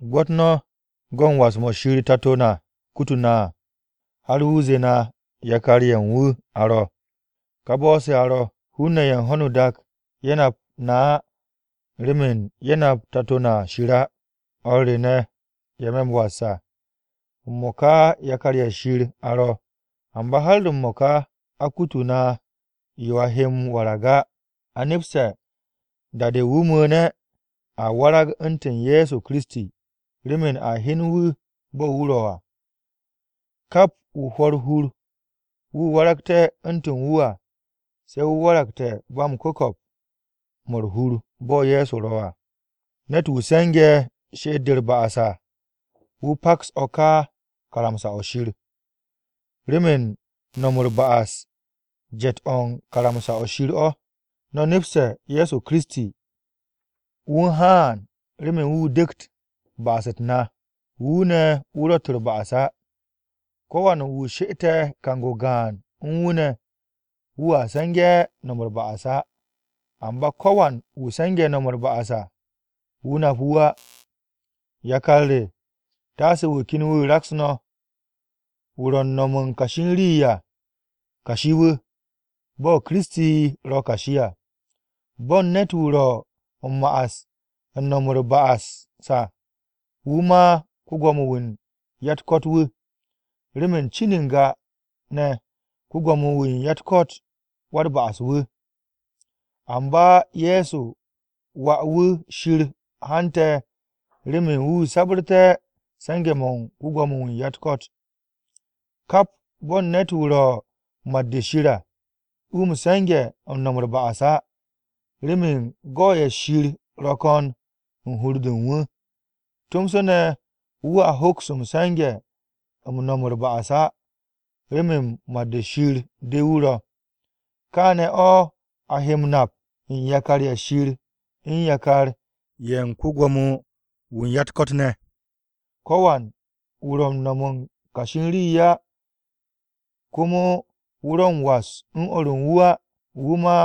Gwo̱t no̱ go̱ u̱n was-mo̱ Shir Tato na kutu̱ na à, har wu̱ zee na yakar-ye̱ u̱n wu̱ a ro̱. Ka bo̱o̱se̱ a ro̱. Hun-ne̱ ye̱ u̱n ho̱no o-dak ye̱ nap na á, remen ye̱ nap Tato na Shir á. O̱r re ne̱, ye̱ me̱ m-was à, m-mo̱ka yakar-ye̱ Shir a ro̱. Amba har m-mo̱ka a kutu̱ na yo a he m-warag á. A nepste̱ da-de wu̱ mu̱u̱ne̱, a warag u̱ntu̱n Ye̱so Kiristi, remen a hyen wu̱ bo̱ wu̱ ro̱ à. Kap wu̱ hwo̱ u̱r-hur wu̱ waragte̱ u̱ntu̱n wu̱ à, se̱ wu̱ waragte̱ ba m-ku̱ko̱p 'mo̱ u̱r-hur bo̱ Ye̱so ro̱ à. Ne̱t-wu̱ se̱nge̱ she'et-de u̱r-ba'as à, wu̱ paks o̱ ka karamsa-o̱ Shir. Remen no̱m u̱r-ba'as jet u̱n karamsa-o̱ Shir o̱. No̱ nepste̱ Ye̱so Kiristi, wu̱ u̱n haan remen wu̱ dek ba'as-u̱t na. Wu̱ ne̱ wu̱ ro̱tt u̱r-ba'as á. Ko̱wan wu̱ she'ete̱ kang-o gaan u̱n wu̱ ne̱, wu̱a se̱nge̱ no̱m u̱r-ba'as á. Amba ko̱wan wu̱ se̱nge̱ no̱m u̱r-ba'as, wu̱ nap wu̱ á. Yakar re, taase wu̱ ken wu̱ raks no̱, wu̱ ro̱ u̱n no̱m u̱n kashi u̱n rii à, kashi-wu̱, bo̱ Kiristi ro̱ o-kashi à. Bo̱n ne̱t-wu̱ ro̱ m-ma'as u̱n no̱m u̱t-ba'as à, wu̱ mà ko-Gwo̱mo-wu̱ u̱n ya-u̱t-ko̱t wu̱, remen cin n-ga ne̱ ko-Gwo̱mo-wu̱ u̱n ya-u̱t-ko̱t wa-u̱t-ba'as-wu̱. Amba Ye̱so Wà-wu̱ Shir haante̱ remen wu̱ sabu̱rté̱ se̱nge̱-mo̱ u̱n ko-Gwo̱mo-wu̱ u̱n ya-u̱t-ko̱t. Kap bo̱n ne̱t-wu̱ ro̱ mat-de Shir à, wu̱ m-se̱nge̱ u̱n no̱m u̱r-ba'as á, remen go̱-ye̱ Shir ro̱ ko̱n u̱n hur-de u̱n wu̱. Tomso ne̱ wu̱a hoks m-se̱nge̱ m-no̱m u̱r-ba'as á, remen mat-de Shir de wu̱ ro̱. Kaane̱ o̱ a he m-nap u̱n yakar-ye̱ Shir u̱n yakar-ye̱ u̱n ko-Gwo̱mo-wu̱ u̱n ya-u̱t-ko̱t ne̱. Ko̱wan wu̱ ro̱ m-no̱m u̱n kashi rii á, komo wu̱ ro̱ u̱n was u̱n o̱r u̱n wu̱ á, wu̱ mà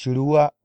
Shir wu̱ á.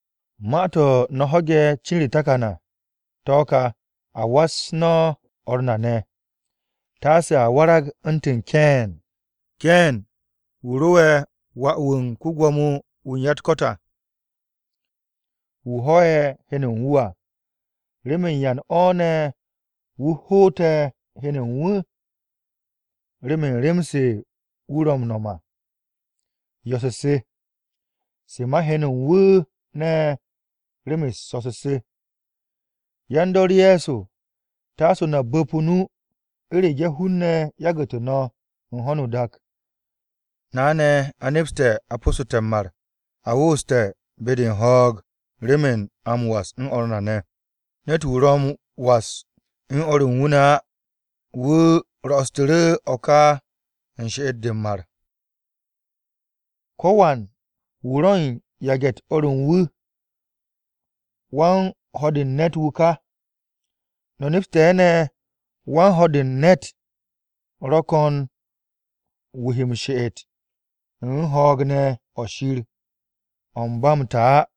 Ma-to̱ no̱ ho̱ge̱ cin u̱r-takan à, to̱ ka, a was no̱ o̱r na ne̱. Taase a warag u̱ntu̱n Keen. Keen wu̱ ro'e̱ wà-wu̱ u̱n ko-Gwo̱mo-wu̱ u̱n ya-u̱t-ko̱t à, wu̱ ho̱'e̱ heno u̱n wu̱ à. ¿Remen yan o̱ ne̱ wu̱ hoote̱ heno u̱n wu̱? Remen rem-se wu̱ ro̱ m-no̱m à, yo̱-se se, se ma heno u̱n wu̱ ne̱, rem-u̱s so̱-se se. Yan-dor Ye̱so, taase no̱ bu̱p o-nu u̱rege̱ hun-ne̱ yagu̱tu̱ no̱ u̱n ho̱no o-dak. Na ne̱, a nepste̱ a po̱ssu̱te̱ m-mar, a wooste̱ be-de u̱n ho̱o̱g remen a m-was u̱n o̱r na ne̱ ne̱. Ne̱t-wu̱ ro̱ m-was u̱n o̱r u̱n wu̱ á, wu̱ ro̱'o̱su̱tu̱ru̱ o̱ ka u̱n she'et-de m-mar. Ko̱wan wu̱ ro̱n yage̱-u̱t o̱r u̱n wu̱, wan-ho̱ de u̱n ne̱t-wu̱ ka. No̱ nepste̱ ne̱ wan-ho̱ de u̱n ne̱t ro̱ ko̱n wu̱ he m-she'et u̱n ho̱o̱g ne̱ o̱ Shir o̱ u̱n ba m-ta á.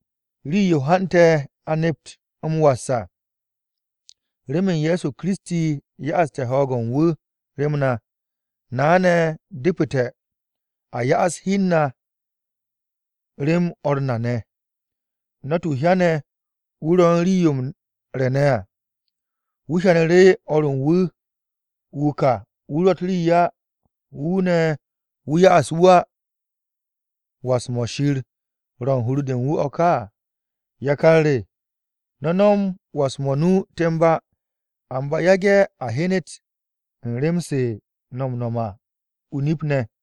Rii-yo hante̱ a nept m-was à, remen Ye̱so Kiristi ya'aste̱ ho̱o̱g-o̱ u̱n wu̱ rem na. Na ne̱, depu̱te̱ a ya'as hi u̱n na rem o̱r na ne̱. Ne̱t-wu̱ hyane̱ wu̱ ro̱ u̱n rii-yo m-re̱ ne̱ à, wu̱ hyanu̱ru̱ o̱r ru wu̱ wu̱ ka wu̱ ro̱tt rii á, wu̱ ne̱, wu̱ 'ya wu̱ á, ¿was-mo̱ Shir ro̱ u̱n hur-de u̱n wu̱ o̱ ka? Yakar re, no̱ no̱m was-mo̱ o-nu temb á, amba yage̱ a hyenet u̱n rem-se no̱ m-no̱m à o-nip ne̱.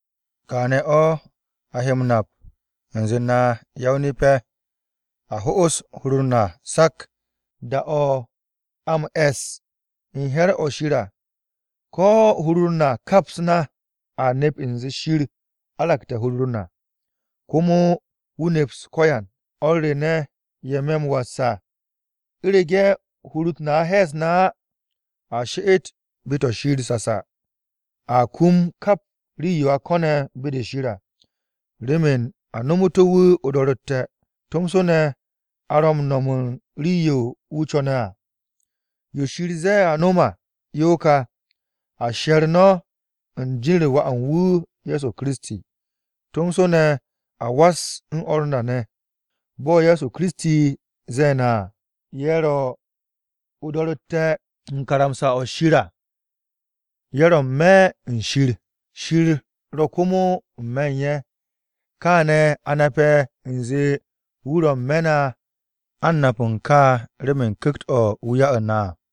Kaane̱ o̱ a nape̱ u̱nze na ya-o-nip-ye̱, a ho'os hur u̱n na sak da-o̱ a m-e̱s u̱n he̱r-o̱ Shir à. Ko̱ hur-u̱r na kaps na, a nep u̱nze Shir aragte̱ hur-u̱r na, komo wu̱ neps ko̱yan. O̱r re ne̱, ye̱ me̱ m-was à, u̱rege̱ hur-u̱t na he̱e̱s na á, a she'et be-to̱ Shir sasa. Aa kum kap rii-yo a ko̱ne̱ be-de Shir à, remen a nomu̱tu̱ wu̱ o-do̱ro̱tte̱, tomso ne̱ a ro̱ m-no̱m u̱n rii-yo wu̱ co̱ne̱ à. Yo Shir ze̱e̱ a no̱m à yo ka: A she̱r no̱ u̱n jin-u̱r Wà u̱n wu̱ Ye̱so Kiristi, tomso ne̱ a was u̱n o̱r na ne̱ ne̱, bo̱ Ye̱so Kiristi ze̱e̱ na à. Ye̱ ro̱ o-do̱ro̱tte̱ u̱n karamsa-o Shir à ye̱ ro̱ n-me̱ u̱n Shir, Shir ro̱ komo n-me̱ u̱n ye̱. Kaane̱ a nape̱ u̱nze wu̱ ro̱ n-me̱ u̱n na: A u̱n nap to̱ kà remen Ku̱kt-o̱ wu̱ ya'u̱ na à.